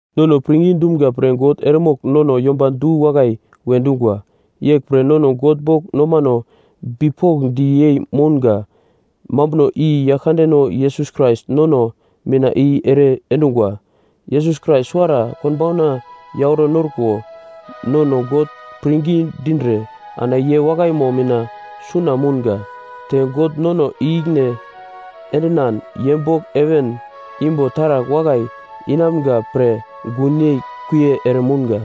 Nono pirngi dumga pre God eremogl nono yomba du-wakai we dungwa. Yeglpre nono God bogl nomano bipokndi yei mounga mambuno i Yaglkandeno Yesus Krais nono mina i ere endungwa. Yesus Krais suwara konbauna yauro norko nono God pirngi dindre ana ye wakaimo mina suna mounga. Te God nono i-ikine endinan ye bogl heven imbo taragl wakai inamga pre gunyei kuie ere mounga.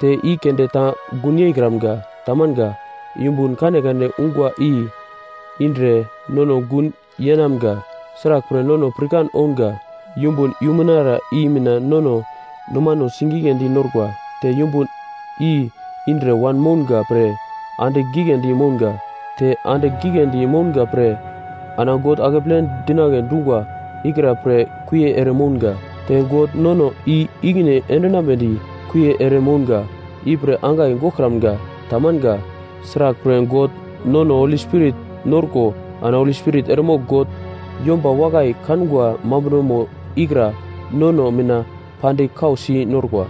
Te i keunde ta gun yeikramga, tamanga, yumbun kanekane ungwa i indre nono gun yeinamga. Sraglpre, nono pirkan ounga yumbun yumunara i mina nono nomano sigigledi norkwa, te yumbun i indre wanmounga pre andigl giglendi mounga, te andigl giglendi mounga pre ana God akeple dinagle dungwa ikra pre kuie ere mounga. Te God nono i-ikine endinambedi kuie ere mounga ipre angai goglkramga, tamanga. Sraglpre, God nono Holi Spirit norko ana Holi Spirit eremogl God yomba wakai kangwa mambunomo ikra nono mina pandigl kausi norkwa.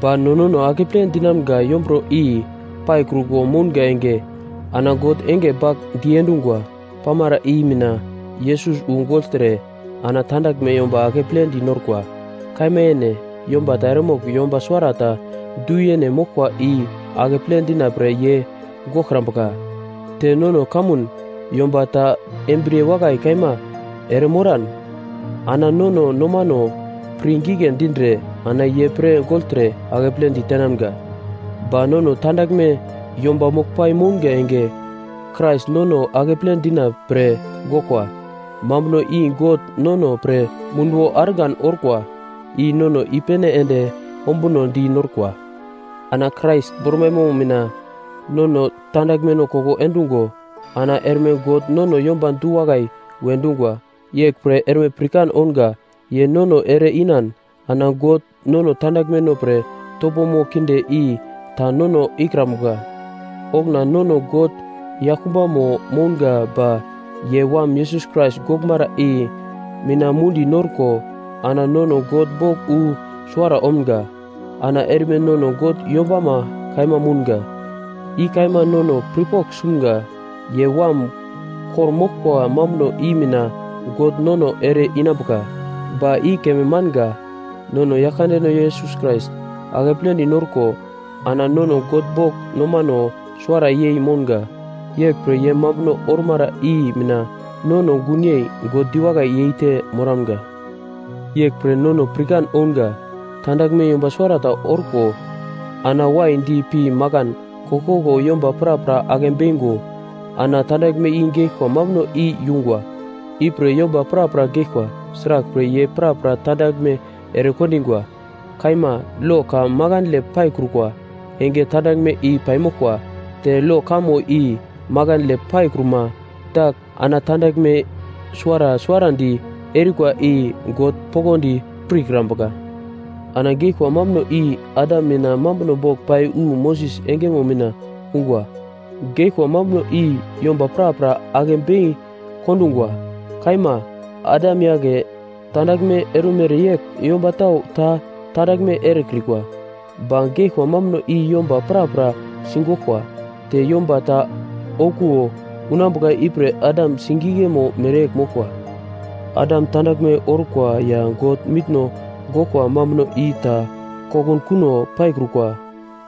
Ba no nono akeple dinamga yomburo i paikruko mounga enge, ana God enge bagl diendungwa pamara i mina Yesus wu gogltre ana tandaglme yomba akepledi norkwa. Kaima yene, yomba ta eremogl yomba suwarata du-yene moglkwa i akeple dina pre ye goglkrambuka. Te nono kamun yomba ta embriye wakai kaima eremoran, ana nono nomano pir gigle dindre ana ye pre gogltre akeple ditenamga. Ba nono tandaglme yomba moglpai mounga enge, Krais nono akeple dina pre goglkwa, mambuno i God nono pre munduwo argan orkwa i nono i-pene ende ombunodi norkwa. Ana Krais bormaimo mina nono tandaglmeno koko endungo ana erme God nono yomba du-wakai we dungwa. Yeglpre erme pirkan ounga ye nono ere-inan ana God nono tandaglmeno pre topomo kinde i ta nono ikrambuka. Okuna nono God yaglkumbamo mounga ba ye Wam Yesus Krais goglmara i mina mundi-norko ana nono God bogl wu suwara omga. Ana erme nono God yombama kaima mounga, i kaima nono pirpogl sumga, ye Wam kor-moglkwa mambuno i mina God nono ere-inambuka. Ba i keme manga. Nono Yaglkandeno Yesus Krais akepledi norko ana nono God bogl nomano suwara yei mounga. Yeglpre ye mambuno ormara i mina nono gunyei God diwakai yeite moramga. Yeglpre nono pirkan ounga, tandaglme yomba suwarata orko ana waidi pi makan koglkoglo yomba prapra ake beingo, ana tandaglme i geglkwa mambuno i yungwa. Ipre yomba prapra geglkwa, sraglpre, ye prapra tandaglme ere kondingwa. Kaima, lo ka makandle paikrukwa enge tandaglme i paimoglkwa. Te lo kamo i makandle paikruma dagl ana tandaglme suwara suwarandi erikwa i God poglodi pirkrambuka. Ana geglkwa mambuno i Adam mina mambuno bogl pai wu Moses engemo mina ungwa. Geglkwa mambuno i yomba prapra ake bei kondungwa. Kaima, Adam yagle tandaglme erumere yegl yomba tau ta tandaglme erekrikwa, ba geglkwa mambuno i yomba prapra sigoglkwa. Te yomba ta okuwo unambuka ipre Adam sigiglemo mereyegl moglkwa. Adam tandaglme orkwa ya God mitno goglkwa mambuno i ta kokunkuno paikrukwa.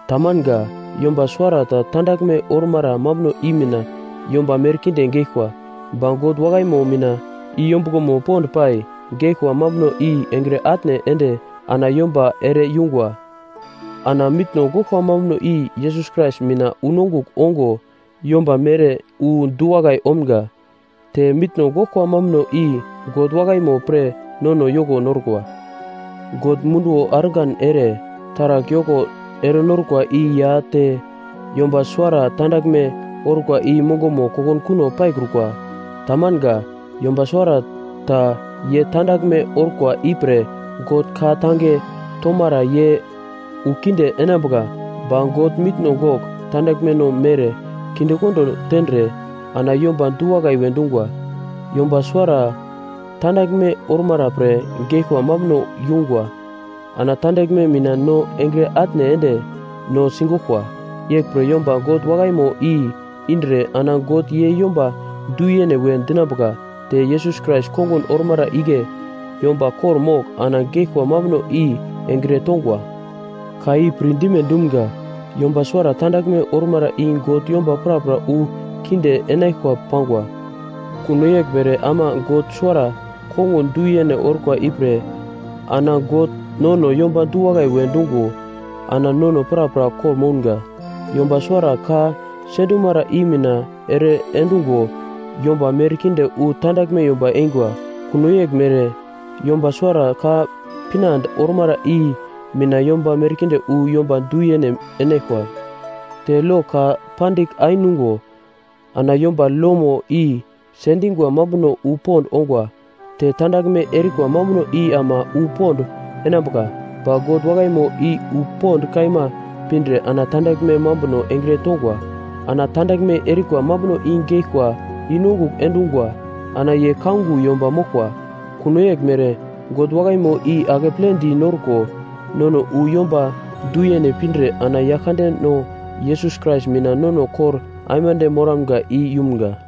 Tamanga. Yomba suwarata tandaglme ormara mambuno i mina yomba merkinde geglkwa. Ba God wakaimo mina i yombuglomo pond pai, geglkwa mambuno i engre atne ende ana yomba ere yungwa. Ana mitno goglkwa mambuno i Yesus Krais mina unongugl ongo yomba mere wu du-wakai omga, te mitno goglkwa mambuno i God wakaimo pre nono yoko norkwa. God munduwo argan ere taragl yoko erenorkwa i ya te yomba suwara tandaglme orkwa i mongomo kokunkuno paikrukwa. Tamanga. Yomba suwara ta ye tandaglme orkwa ipre God ka-tange tomara ye wu kinde inambuka. Ba God mitno gogl tandaglmeno mere kindekondo tendre ana yomba du-wakai we dungwa. Yomba suwara tandaglme ormara pre geglkwa mambuno yungwa ana tandaglme mina no engre atne ende no sigoglkwa. Yeglpre yomba God wakaimo i indre ana God ye yomba du-yene we dinambuka te Yesus Krais kongun ormara igle yomba kor-mogl ana geglkwa mambuno i engre tongwa. Ka i pirdime dumga, yomba suwara tandaglme ormara i God yomba prapra wu kinde inaglkwa pangwa. Kuno yeglmere ama yomba suwara kongun du-yene orkwa ipre ana God nono yomba du-wakai we dungo ana nono prapra kor-mounga. Yomba suwara ka sendumara i mina ere-endungo yomba merkinde wu tandaglme yomba eingwa. Kuno yeglmere yomba suwara ka pinande ormara i mina yomba merkinde wu yomba du-yene enaglkwa. Te lo ka pandigl ainungo ana yomba lomo i sendingwa mambuno wu pond ongwa. Te tandaglme erikwa mambuno i ama wu pond enambuka. Ba God wakaimo i wu pond kaima pindre ana tandaglme mambuno engre tongwa. Ana tandaglme erikwa mambuno i geglkwa i-nongugl endungwa ana ye kaungo yomba moglkwa. Kuno yeglmere, God wakaimo i akepledi norko nono wu yomba du-yene pindre ana Yaglkandeno Yesus Krais mina nono kor aimande moramga i yumga.